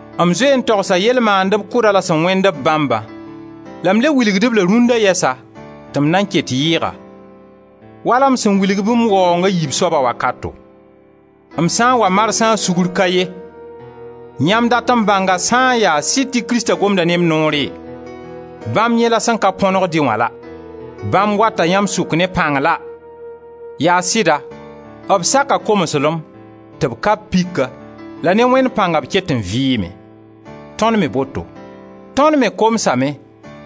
M zoe n togsa yell mandeb kʋdã la sẽn wẽnd b bãmbã, la m le wilgd-b la rũnna yɛsa, tɩ m nan ket yɩɩga, wala m sẽn wilg-b m waoonga yiib soaba wakato: m sã n wa marsã sugr ka ye. Yãmb dat n bãnga sã n yaa sɩd tɩ Krista gomda ne m noore? Bãmb yẽ la sẽn ka põnegd-y wã la, bãmb wata yãmb sʋk ne pãng la! Yaa sɩda, b saka komslem, tɩ b ka-b pika la ne Wẽnd pãnga b ket n vɩɩme. Tõnd me boto. Tõnd me komsame,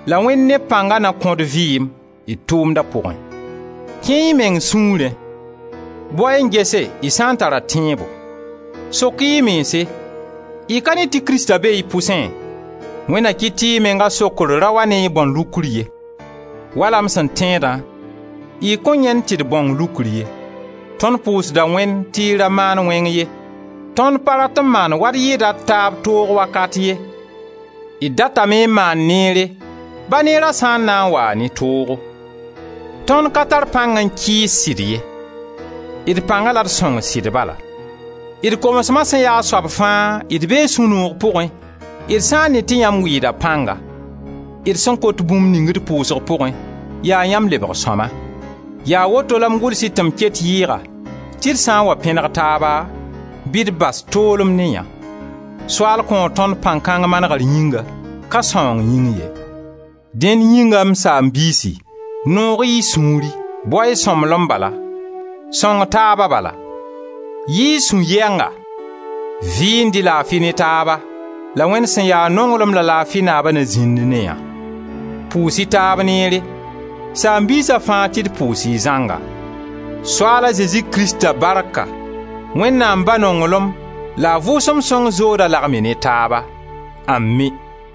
la Wẽnd ne b pãngã na kõ-d vɩɩm, d tʋʋmda pʋgẽ. Kẽe-y y meng sũurẽ, bao-y n gese y sã n tara tẽebo. Sok-y y mense, y ka ne tɩ Krista be y pʋsẽ. Wẽnd na kɩt tɩ y menga sokr ra wa ne y bãon-lukr ye. Wala m sẽn tẽedã, y kõn yãend tɩ d bãong lukr ye. Tõnd pʋʋsda Wẽnd tɩ y ra maan wẽng ye. Tõnd pa rat n maan waa d yɩɩda d taab toog wakat ye, d datame n maan neere, ba neera sã n na n waa ne toogo. Tõnd ka tar pãng n kɩɩs sɩd ye, d pãnga la d sõng sɩd bala. D komsma sẽn ya a soab fãa, d bee sũ-noog pʋgẽ, d sã n ne tɩ yãmb wɩɩda pãnga. D sẽn kot bũmb ning d pʋʋsg pʋgẽ, yaa yãmb lebg sõma. Yaa woto la m gʋls-y tɩ m ket yɩɩga tɩ d sã n wa pẽneg taaba bɩ d bas toolem ne yã; Soaal kõo tõnd pãng kãng manegr yĩnga, ka sãoong yĩng ye. Dẽn yĩnga, m saam-biisi, noog-y y sũuri, bao-y sõmblem bala, sõng-taaba bala; yɩɩ-y sũ-yɛnga, vɩɩnd-y laafi ne taaba, la Wẽnd sẽn ya nonglem la laafi Naaba na zĩnd ne yã! Pʋʋs-y taab neere. Saam-biisa fãa tɩ d pʋʋs y zãnga. Soaala Zezi Krista barka, Wẽnnaam Ba nonglem la a Vʋʋsem Sõng zoodo lagem y ne taaba. Ami!